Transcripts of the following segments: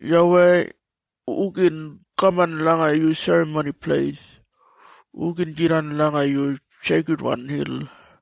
YAWEI, hu gin kaman langa yu Serramoni Pleis? Hu gin jidan langa yu seikridwan hil?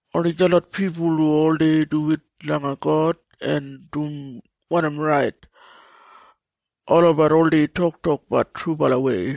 Oni detlot pipul hu oldei duwit langa God en dum wanim rait. Olabat oldei toktokbat trubalawei.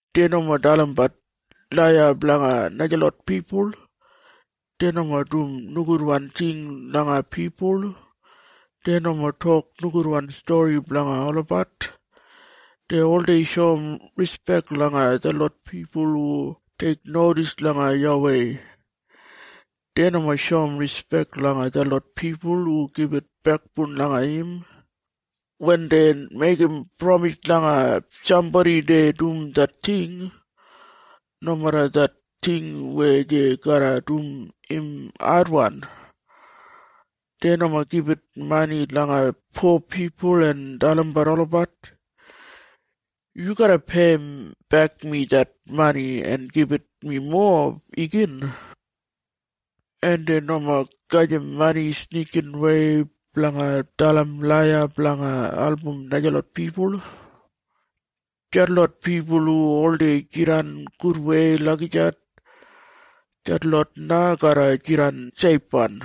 Dei nomo dalimbat laiya blanga najalot pipul. Dei nomo dum nogudwan ting langa pipul. Dei nomo tok nogudwan stori blanga olabat. Dei oldei shoum rispek langa detlot pipul hu teiknodis langa YAWEI. Dei nomo shoum rispek langa detlot pipul hu gibit bekboun langa im. Wen dei meigim pramis langa sambodi dei dum det ting, nomeda det ting weya dei garra dum im adwan. Dei nomo gibit mani langa po pipul en dalim olabat, “Yu garra peiyimbek mi det mani en gibit mi mowa igin.” En dei nomo gajim mani snikinwei blanga dalim laiya blanga album najalot pipul. Detlot pipul hu oldei jidan gudwei lagijat, detlot na garra jidan seifwan.